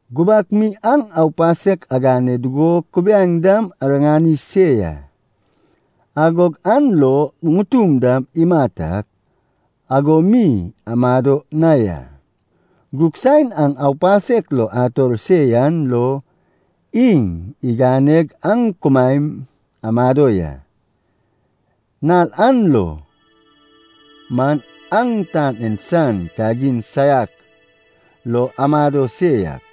Gubak mi aŋ aupasek agane dugo kubiaeŋ dam ariŋani se ya. Agog an lo ŋutum dam imat ak, ago mi amado na ya. Gug saen aŋ aupasek lo ator se yan lo iŋ iganeg aŋ kumaen amado ya. Nal an lo man aŋ tan en san kagin saiak lo amado se yak,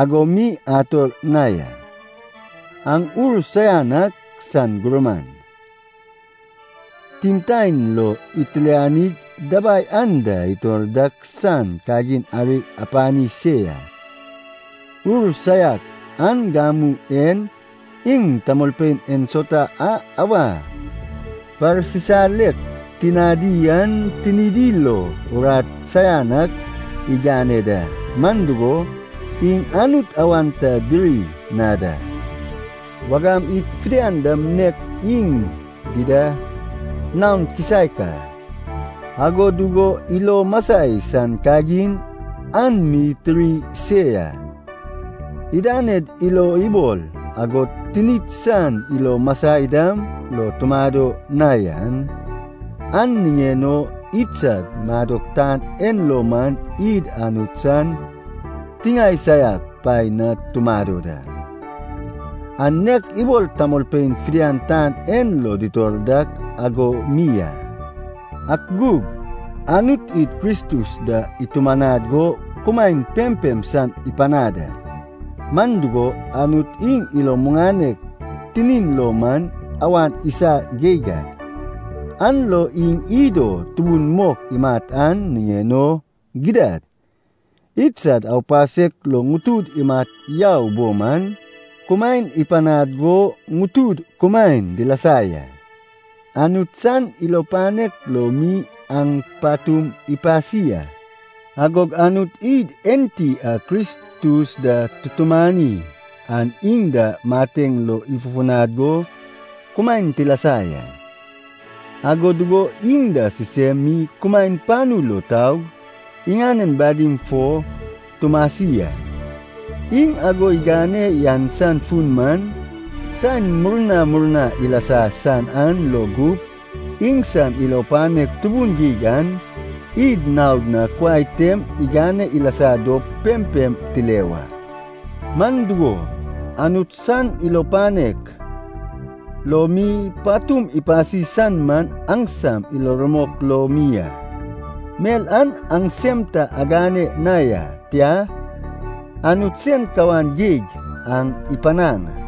ago mi ator na ya. Aŋ ur saian ak sad gurman, timtaen lo itilanig dabai anda itor dak san kagin ari apani se ya. Ur saiak an gamu en iŋ tamolpein ensauta a awa parsisalek tinadi an, tinidi lo urat saian ak igane da. Man dugo, iŋ Anut awan ta diri na da. Wagam id fidian dam nek iŋ dida naon kisaek a, ago dugo ilo masai san kagin an mi tiri se ya. Idaned ilo ibol agod tinid san ilo masai dam lo tumado na yan, an niŋen o idsad madok tan en lo man id Anut san tiŋae saiak paen na tumado da. An nek ibol tamolpein fidian tan en lo ditor dak, ago mi a. Ak gug, Anut id Kristus da itumanad go kumaen pempem san ipanad a. Man dugo, Anut iŋ ilo muŋanek tinin lo man awan isa geig a, an lo iŋ id o tubun mok imat an niŋen o, gidad, idsad aupasek lo ŋutud imat yau bo man, kumaen ipanad go ŋutud kumaen dilasa ya. (Anut san ilo panek lo mi aŋ patum ipasi a.) Agog Anut id enti a Kristus da tutumani an iŋ da mateŋ lo ifufunad go kumaen tilasa ya. Ago dugo iŋ da sisem mi kumaen panu lo taug iŋanen badim fo tumasi a. Iŋ ago igane yan san fun man, saen murna murna ilasa san an lo gup iŋsan ilo panek tubun geig an id naod na kuai tem igane ilasa dop pempem tile wa. Man dugo, Anut san ilo panek lo mi patum ipasi san man aŋsam ilo rumok lo mi a. Mel an aŋsem ta agane na ya. Tia, Anut sen kawan geig aŋ ipanaŋ a.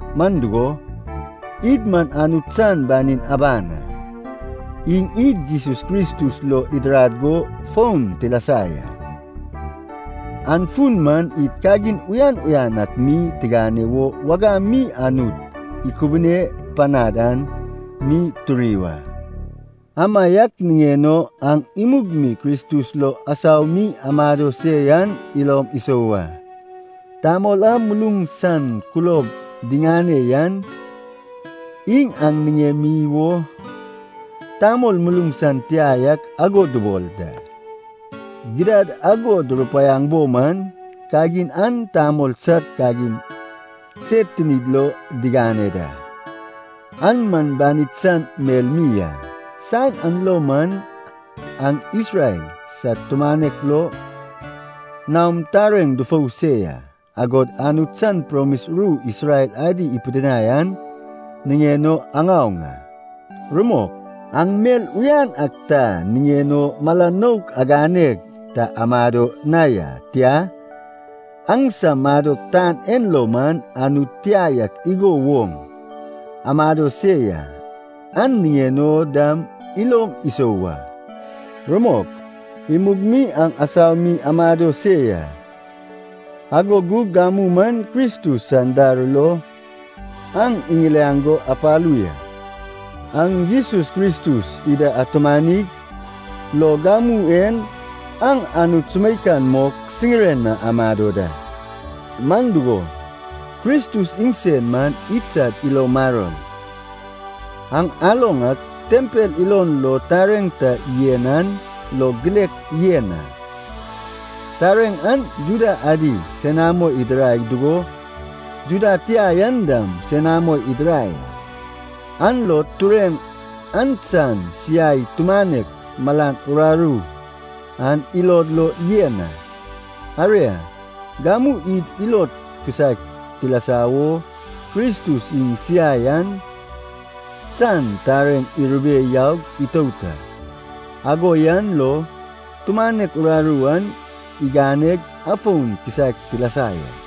Man dugo, id man Anut san banin aban a. Iŋ id Jesus Kristus lo idirad go foun tilasa ya. An fun man id kagin uyan uyan ak mi tigane wo wagam mi Anut ikubune panad an mi turi wa. Amaiak niŋen o aŋ imug mi Kristus lo asau mi amado se yan ilom isou wa. Tamol a muluŋ san kulob diŋane yan, iŋ aŋ niŋemi wo tamol muluŋ san tia yak ago dubol da. Gidad ago durupaiaŋ bo man, kagin an tamol sad kagin sed tinid lo digane da, an man banid san mel mi a. Saen an lo man aŋ Isrel sad tumanek lo naom tareŋ dufou se ya, agod Anut san promis ru Isrel adi ipidinai an niŋen o aŋaoŋ a. Rumok, aŋ mel uyan ak ta niŋen o mala naok aganeg ta amado na ya, tia, aŋsam madok tan en lo man, Anut tia yak igo woŋ amado se ya, an niŋen o dam ilom isou wa. Rumok, imug mi aŋ asau mi amado se ya. Ago gug gamu man Kristus san dar lo aŋ iŋiliaŋ go apalu ya. Aŋ Jesus Kristus ida atumanig, lo gamu en aŋ Anut sumeikan mok siŋiren na amado da. Man dugo, Kristus iŋsen man idsad ilo maror. Aŋ aloŋ ak, tempel ilon lo tareŋ ta yen an lo gilek yen a, tareŋ an Juda adi senamo idirai dugo Juda tia yan dam senamo idirai a, an lo tureŋ an san siai tumanek malan uraru an ilod lo yen a. Aria, gamu id ilod kisaek tilasa wo Kristus iŋ siai an san tareŋ irube yaug itout a, ago yan lo tumanek uraru an iganeg afon kisaek tilasa ya.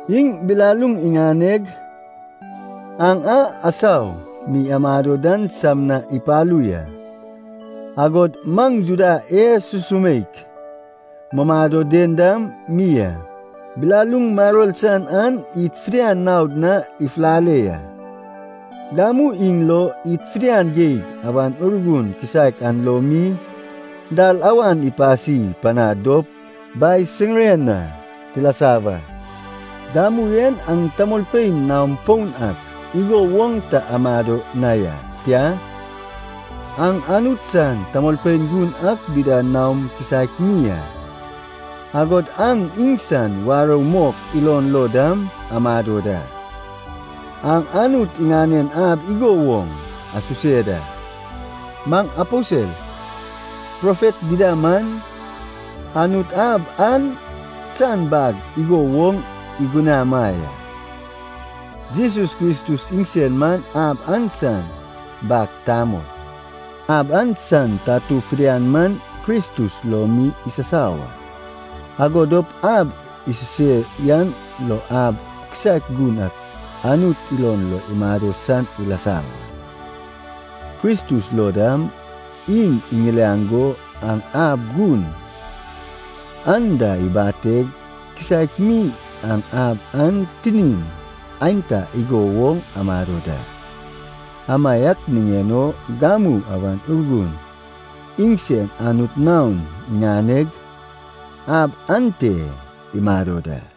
Iŋ bilaluŋ iŋaneg aŋ a asau mi amado dan sam na ipalu ya, agod maŋ Juda e sumsumeik mumado den dam mi a. Bilaluŋ maror san an id fidian naod na ifulale ya. Gamu iŋ lo, id fidian geig Awan Urgun kisaek an lo mi dalawan ipasi panad dop Bai siŋiren na tilasa wa. Gamu en aŋ tamolpein naom foun ak igo woŋ ta amado na ya. Tia, aŋ Anut san tamolpein gun ak dida naom kisaek mi a, agod aŋ iŋsan warou mok ilon lo dam amado da. Aŋ Anut iŋanen ab igo woŋ isuse da. Maŋ aposel, profet dida man, Anut ab an san bag igo woŋ igunama ya. Jesus Kristus iŋsen man ab an san bag tamol. Ab an san tatu fidian man Kristus lo mi isasau a. Ago dop ab isuse yan lo ab kisaek gun ak Anut ilon lo imado san ilasa wa. Kristus lo dam, iŋ iŋiliaŋ go aŋ ab gun an da ibateg kisaek mi aŋ ab an tinin aenta igo woŋ amado da. Amaiak niŋen o gamu Awan Urgun iŋsen Anut naon iŋaneg ab ante imado da.